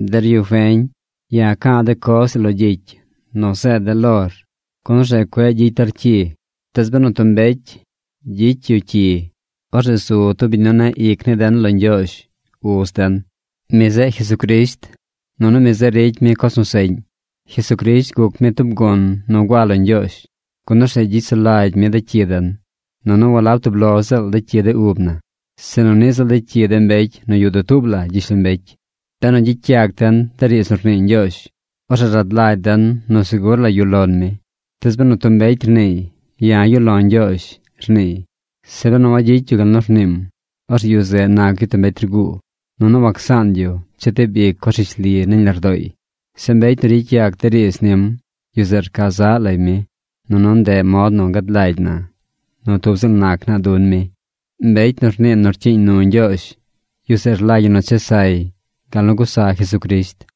Der yu feñ, ya̱ ca̱a̱ de coz ii lo gyicy nu zeed de̱ lor, gun orzeꞌ cueꞌ gyicy der cyi. Tees benu tub mbecy gyicy yu cyi, orzeꞌ zu tub biñ nu neꞌ ic ni den lo Ñgyoozh, Uz den. Mi zeꞌ Jesucrisht. Nunu mi zeꞌ ricy mi coz nu seꞌñ. Jesucrisht guc mi tub gun nu gua lo Ñgyoozh, gun orzeꞌ gyicy sulagy mi de cyi den: nunu walab tub lo ziꞌl de cyi de ub na, sinu niꞌ ziꞌl de cyi de mbecy nu yuꞌ dutuub la gyishlombecy. Benu gyicy yac den de riidz nu rnii Ñgyoozh, orzeꞌ rad lagy den nu segur la yuꞌ lon mi. Tees benu tub mbecy rniiy: “Ya̱ yuꞌ lo̱ Ñgyoozh”, rniiy, zeꞌ benu wagyicy yu gal nu rniim, orzeꞌ yu zeꞌ nac yu tub mbecy rguu, nunu wacsaan yu chetib ic coz rishli nañ lardooy. Zeꞌ mbecy nu ricy yac de riidz nim, yu zeꞌ rca zaꞌ lay mi. Nunu ndeꞌ mod nu gad lagy na nu tub ziꞌl nac naa dun mi. Mbecy nu rnii nu rcyiiñ nu Ñgyoozh, yu zeꞌ rlagy ñi nu chesay gal nu gusa Jesucrisht.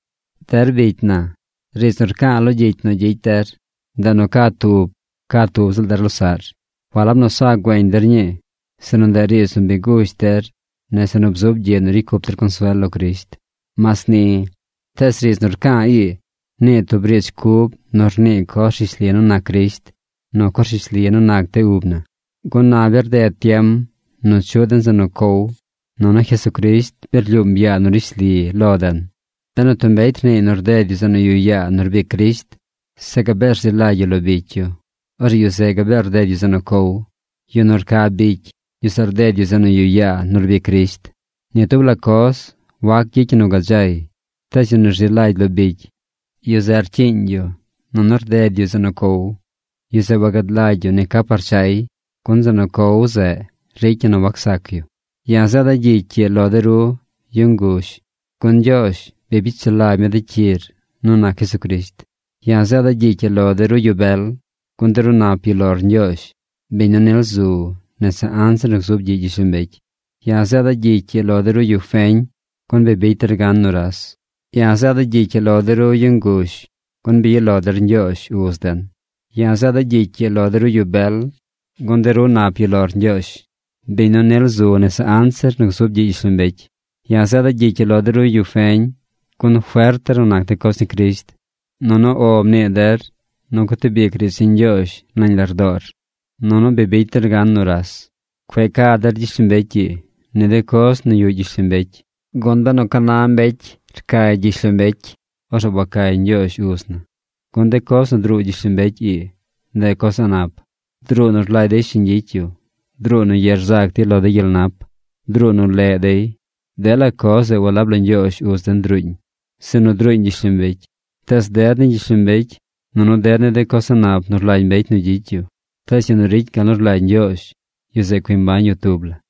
Der bicy na, riidz nu rca̱a̱ lo gyicy nu gyicy der, ndeꞌ nu ca tub ca tub ziꞌl der losaꞌr. Walab nu sa güeñ der ñii, sinu ndeꞌ riidz nu bi gush der nese nu bzub gyiꞌ nu ricy cup der consuel lo Crisht. Mas ni, tees riidz nu rca̱a̱ ii, nii tub riidz cub nu rnii coz rishli nu nac Crisht nu coz rishli nu nac de ub na. Gun na bi rded tiem nu chuꞌ den zeꞌ nu cow, nunu Jesucrisht bi rlyuum yaa nu rishli lo den. Benu tub mbecy rniiy nu rded yu zeꞌ nu yuꞌ yaa nu rbic Crisht, zeꞌ gabee rzi lagy yu lo bicy yu, orzeꞌ yu zeꞌ gabee rded yu zeꞌ nu cow. Yu nu rca bicy, yu zeꞌ rded yu zeꞌ nu yuꞌ yaa nu rbic Crisht. Ni tub la coz wac gyicy ñi nu gadzay. Tees yu nu rzi lagy lo bicy, yu zeꞌ rcyiiñ yu nunu rded yu zeꞌ nu cow. Yu zeꞌ wagad lagy yu ni ca par chay, gun zeꞌ nu cow zeꞌ ricy ñi nu wacsac yu. Ya̱ zeeda̱ gyicy ii lo de ru yu nguzh, gun Ñgyoozh bi bicy sulagy mi de cyir nu nac Jesucrisht. Ya̱ zeeda̱ gyicy ii lo de ru yu bel, gun de ru nap yuꞌ lor Ñgyoozh, biñ nu nil zu nese anzir nu gzub gyiꞌ gyishlombecy. Ya̱ zeeda̱ gyicy ii lo de ru yu feñ, gun bi bicy der gan nuras. Ya̱ zeeda̱ gyicy ii lo de ru yu nguzh, gun bi yuꞌ lo der Ñgyoozh Uz den. Ya̱ zeeda̱ gyicy ii lo de ru yu bel, gun de ru nap yuꞌ lor Ñgyoozh, biñ nu nil zu nese anzir nu gzub gyiꞌ gyishlombecy. Ya̱ zeeda̱ gyicy ii lo de ru yu feñ, gun fert der nu nac de coz ni Crisht, nunu “O” mnii der nu gutib ic riidz ni Ñgyoozh nañ lardoo der, nunu bi bicy der gan nuras. Cueꞌ ca der gyishlombecy ii, ni de coz nu yuꞌ gyishlombecy, gun benu ca na mbecy cay gyishlombecy, orzeꞌ wacay Ñgyoozh Uz na. Gun de coz nu druu gyishlombecy ii, ndeꞌ coz a̱ꞌ nap. Druu nu rlagy dey shiñ gyicy yu. Druu nu ye rzac dey lo de gyel nap. Druu nu leꞌ dey. Dela coz zeꞌ walab lo Ñgyoozh Uz den druuñ, sinu druuñ gyishlombecy. Tees ded ni gyishlombecy nunu ded ni de coz a̱ꞌ nap nu rlagy mbecy nu gyicy yu, tees yu nu ricy gal nu rlagy Ñgyoozh, yu zeꞌ cui mbañ yu tub la.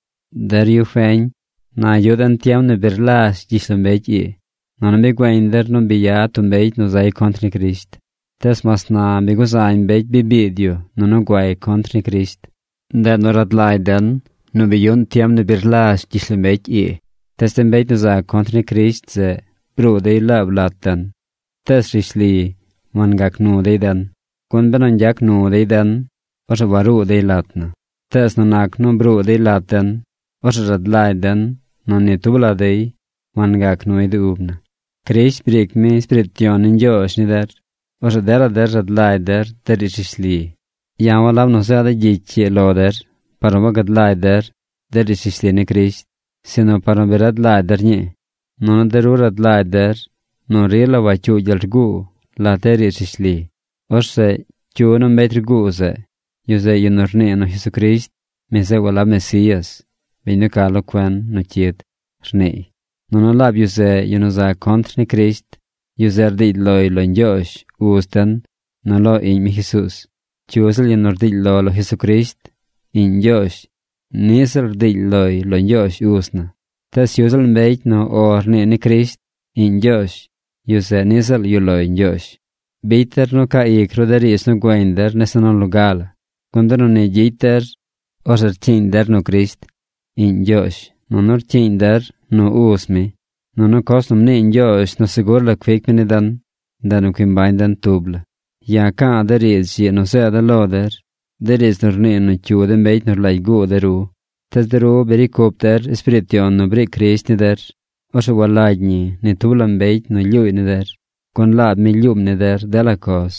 Der yu feñ, na yuꞌ den tiem nu bi rlazh gyishlombecy ii. Nunu bi güeñ der nu bi yad tub mbecy nu zay contr ni Crisht. Tees mas na bi guzañ mbecy bi biid yu nu guay contr ni Crisht. Ndeꞌ nu rad lagy den nu bi yuꞌn tiem nu bi rlazh gyishlombecy ii. Tees de mbecy nu za contr ni Crisht zeꞌ bruu dey laab lat den. Tees rishli wangac nu dey den. Gun benu ñgyac nu dey den, orzeꞌ waruu dey lat na. Tees nu nac nu bruu dey lat den, orzeꞌ rad lagy den nu ni tub la dey wangac nuy de ub na. Crisht briic mi Espiriit Yon ni Ñgyoozh ni der. Orzeꞌ dela der rad lagy der de riidz rishli. Ya̱ walab nu zeeda̱ gyicy ii lo der par nu wagad lagy der de riidz rishli ni Crisht, sinu par nu bi rad lagy der ñii. Nunu de ru rad lagy der nu rila wacyuu gyel rguu lat de riidz rishli. Orzeꞌ ¿cyu nu mbecy rguu zeꞌ? Yu zeꞌ yu nu rnii nu Jesucrisht, mi zeꞌ walab Mesías, biñ nu ca lo cuen nu cyid, rniiy. Nunu laab yu zeꞌ yu nu za contr ni Crisht. Yu zeꞌ rdiily loy lo Ñgyoozh, Uz den, nu lo Iꞌñ mi Jesuuz. Cyu ziꞌl yu nu rdiily lo lo Jesucrisht, Iꞌñ Ñgyoozh, niꞌ ziꞌl rdiily loy lo Ñgyoozh Uz na. Tees cyu ziꞌl mbecy nu “O” rnii ni Crisht, Iꞌñ Ñgyoozh, yu zeꞌ niꞌ ziꞌl yuꞌ loy Ñgyoozh. Bicy der nu caa ic ru de riidz nu güeñ der nese nu loga la. Gun benu ni gyicy der, orzeꞌ rcyiiñ der nu Crisht, Iꞌñ Ñgyoozh, nunu rcyiiñ der nu Uz mi. Nunu coz nu mnii Ñgyoozh nu segur la cuic mi ni den, ndeꞌ nu cui mbañ den tub la. Ya̱ ca̱a̱ de riidz ii nu zeeda̱ lo der, de riidz nu rnii nu cyu de mbecy nu rlagy guu de ru. Tees de ru bi ricy cup der Espiriit Yon nu briic Crisht ni der. Orzeꞌ walagy ñi ni tub la mbecy nu lyuuy ni der. Gun laab mi lyuum ni der dela coz.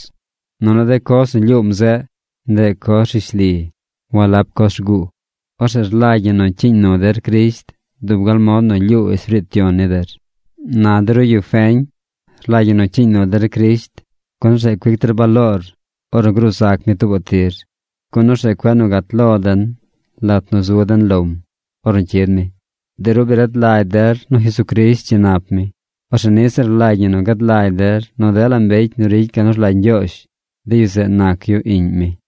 Nunu de coz nu lyuum zeꞌ, ndeꞌ coz rishli, walab coz rguu. Orzeꞌ rlagy ñi nu cyiiñ nu der Crisht dub gal mod nu lyuu Espiriit Yon ni der. Na de ru yu feñ, rlagy ñi nu cyiiñ nu der Crisht, gun orzeꞌ cuic der baloor ornu gruu zac mi tuubaꞌ tir. Gun orzeꞌ cueꞌ nu gat lo den lat nu zu den lom ornu cyid mi. De ru bi rad lagy der nu Jesucrisht dzi nap mi. Orzeꞌ niꞌ ziꞌl rlagy ñi nu gad lagy der nu dela mbecy nu ricy gal nu rlagy Ñgyoozh, de yu zeꞌ nac yu iꞌñ mi.